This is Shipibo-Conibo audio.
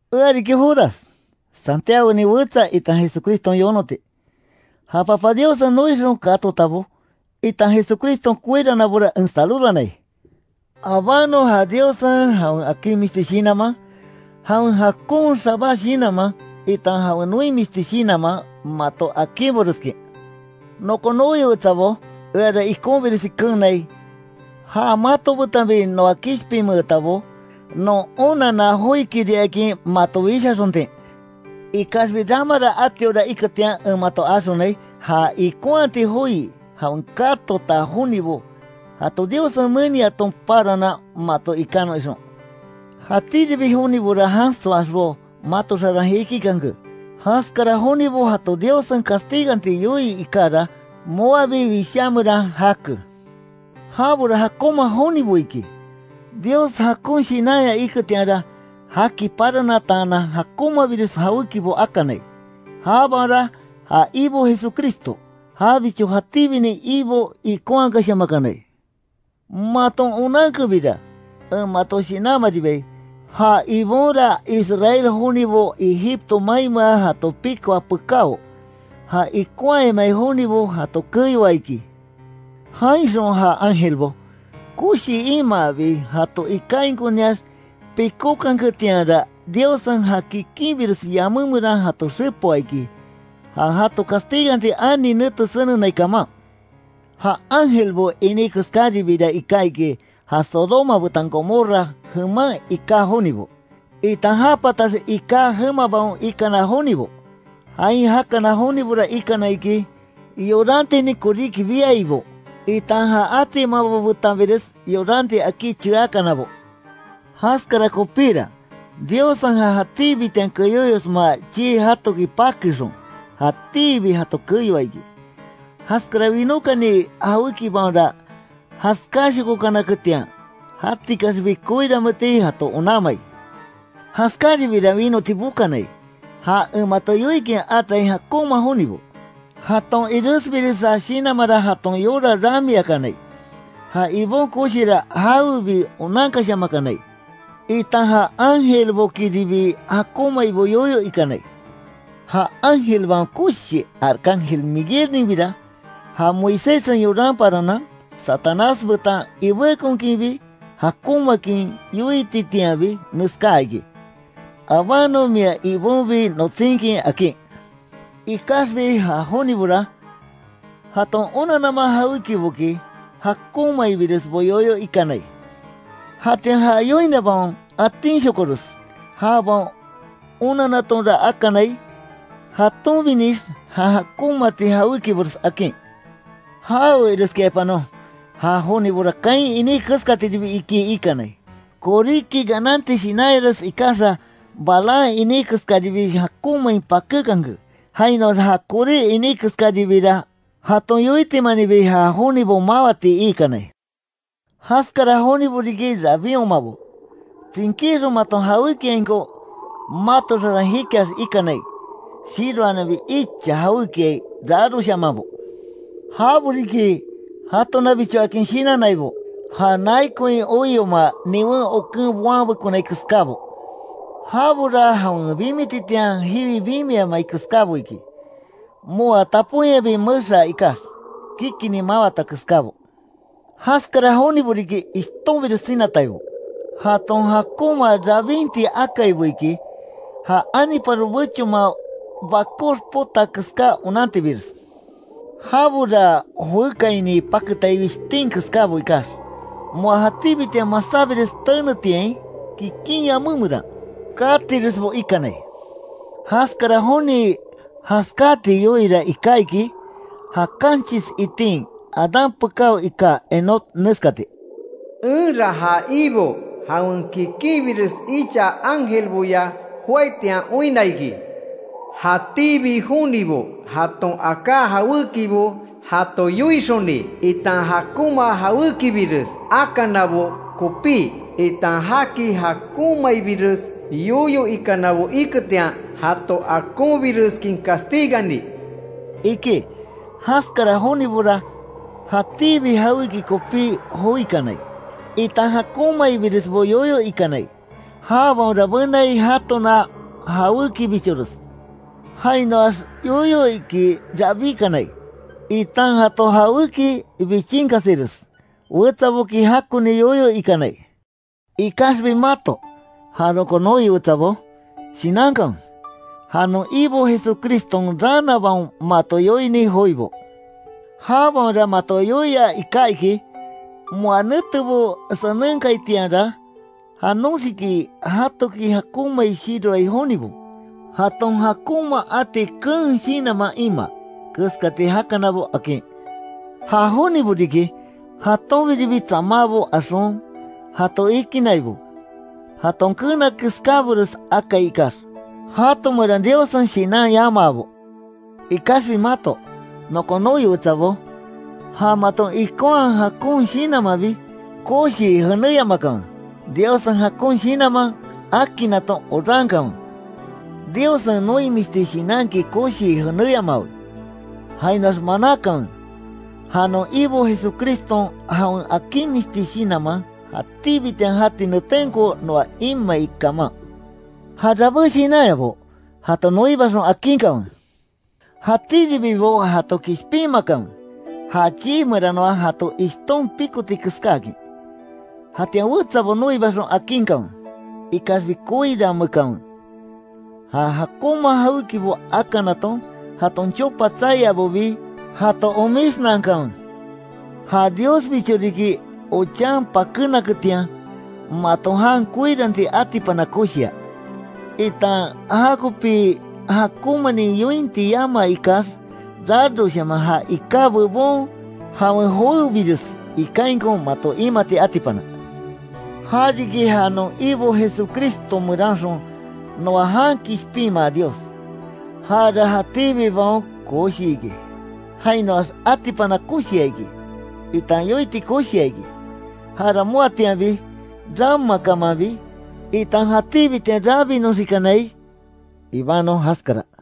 Ea riki Judas, Santiagonin wetsa itan Jesucriston yonoti. Ja Papa Diossen noixon katotabo, itan Jesucriston koiranabora en saludanai. Abánon ja Diossen, jawen akinmisti shinanman, jawen jakon xabá shinanman, itan jawen noimisti shinanman, mato akinboreskin. Nokon noi wetsabó, eara ikonbiresi keenai, ja mato betanbi noa kishpinmeetabo, non onanna joikiriakin mato wishaxontin; ikaxbi ramara atiora iketian en mato axonai, ja ikonhati joi jawen katota jonibo jato Diossen meniaton paranan mato ikanon ixon. Jatíribi jonibora jansoaxbo mato xaran jikikanke. Jaskara jonibo jato Diossen castiganti yoii ikara, moabi Wishá meran jake. Jabora jakonma jonibo iki, Dios jakon shinanya iketianra, jaki paranataanan jakonmabires jawékibo akanai. Jabaonra ja Ibo Jesucristo, jabicho jatíbinin Ibo ikonhakashamakanai. Maton onankebira, en mato shinanmaribai, ja Ibonra Israel jonibo Egipto mainmea jato pikoa pekáo, ja ikonhayamai jonibo jato keyoa iki. Jainxon ja ángelbo, koshi imaabi jato ikainkoniax pikókanketianra, Diossen ja kikinbires yamé meran jato xepoa iki, ja jato castiganti ani nete senenai kaman. Ja ángelbo iní keskaribira iká iki, ja Sodoma betan Gomorra jeman iká jonibo, itan ja patax iká jemabaon ikana jonibo. Jain jakana jonibora ikana iki, yorantinin koríki biaibo, itan ja atimabo betanbires yoranti akí cheakanabo. Jaskara kopíra, Diossen ja jatíbitian keyóyosma chii jatoki pakéxon, jatíbi jato keyoa iki. Jaskara winókani jawékibaonra, jaskáshokonaketian, jatikaxbi koiranmeeti jato onanmai. Jaskáribira winoti bokanai, ja en mato yoikin atai jakonma jonibo. Jaton iresbiresa shinanmanra jaton yora ramiakanai, ja Ibon koshira jawebi onankashamakanai, itan ja ángelbokiribi jakonmaibo yoyo ikanai. Ja ángelbaon koshi arcángel Miguelninbira, ja Moiséssen yoran paranan, Satanás betan ibékonkinbi, jakonmaakin yoititianbi, neskáa iki: “Abanon mia Ibonbi notsinkin”, akin. Ikaxbi ja jonibora, jaton onannama jawékiboki, jakonmaibiresbo yoyo ikanai. Jatian ja yoinabaon atinshokores, jabaon onannatonra akanai, jatonbinix jan jakonmati jawékibores akin. ¡Jawe ireskiaipanon! Ja jonibora, Caín iní keskatiribi iki ikanai. Koríki gananti shinanyares ikaxa, Balaam iní keskaribii jakonmain pakékanke. Jainoax ja Coré iní keskaribiira, jaton yotimaninbi ja jonibo mawati iikanai. Jaskara jonibo riki rabinhomabo, tsinkíxon maton jawékiainko mato xaran jikiax ikanai, shiroananbi icha jawékiai raroshamanbo. Jabo riki, jatonabichoakin shinannaibo, ja nai koin oioma, niwen oken boanbekonai keskábo. Jabora jawen bimititian jiwi bimiamai keskábo iki, moa taponyabi mexaa ikax, kikinni mawata keskábo. Jaskara jonibo riki, ishtonbires sinataibo, jaton jakonma rabinti akaibo iki, ja aniparo bechonman bakox potaa keská onantibires. Jabora joékaini paketai wishtin keskabo ikax, moa jatíbitian masábires tenetiain, kikin yamé meran, katiresbo ikanai. Jaskara joni jaskáti yoiira iká iki, ja kanchis itin Adán pekáo iká Enoc neskati: “Enra ja Ibo jawen kikinbires icha ángelboya joaitian oinna iki, jatíbi jonibo jaton aká jawékibo jato yoixoni, itan jakonma jawékibires akanabo kopí, itan jaki jakonmaibires yoyo ikanabo iketian, jato akonbireskin castigani”, iki. Jaskara jonibora, jatíbi jawéki kopí joikanai, itan jakonmaibiresbo yoyo ikanai. Jabaonra benai jatona jawékibichores. Jainoax yoyo iki rabíkanai, itan jato jawéki bichinkasires, wetsaboki jakoni yoyo ikanai. Ikaxbi mato, ja nokon noi wetsabó, shinankanwe, ja non Ibo Jesucriston raanabaon mato yoini joibo. Jabaonra mato yoia iká iki: “Moa netebo senenkaitianra, janoxiki jatoki jakonmai shiroai jonibo, jaton jakonma ati keen shinanman imaa, keskati jakanabo”, akin. Ja jonibo riki, jatonbiribi tsamabo axon, jato ikinnaibo, jaton keena keskábores akai ikax, jato meran Diossen Shinan yamabo. Ikaxbi mato, nokon noi wetsabó, ja maton ikonhaa jakon shinanmanbi, koshii jenéyamakanwe. Diossen jakon Shinanman akinnaton orankanwe. Diossen noimisti shinanki koshii jeneyamawe. Jainoax manákanwe, ja non Ibo Jesucriston jawen akinmisti shinanman, jatíbitian jati netenko noa imai kaman. Ja rabé shinanyabo, jato noibaxon, akinkanwe. Jatíribibo jato kishpinmakanwe, ja chii meranoa jato ishton pikoti keskáakin. Jatian wetsabo noibaxon akinkanwe, ikaxbi koirameekanwe, ja jakonma jawékibo akanaton, jaton chopa tsaiabobi jato omisnankanwe. Ja Diosbicho riki, ochan pakénaketian, mato jan koiranti atipana koshia, itan jakopi jakonmanin yointi yama ikax, raroshaman ja iká bebon, jawen joébires ikainko mato imati atipana. Ja riki, ja non Ibo Jesucristo meranxon, noa jan kishpinma Dios. Jara jatíbibaon koshi iki, jainoax atipana koshia iki, itan yoiti koshia iki. Jara moatianbi, ramakamanbi, itan jatíbitian rabinoxikanai. Ibanon jaskara.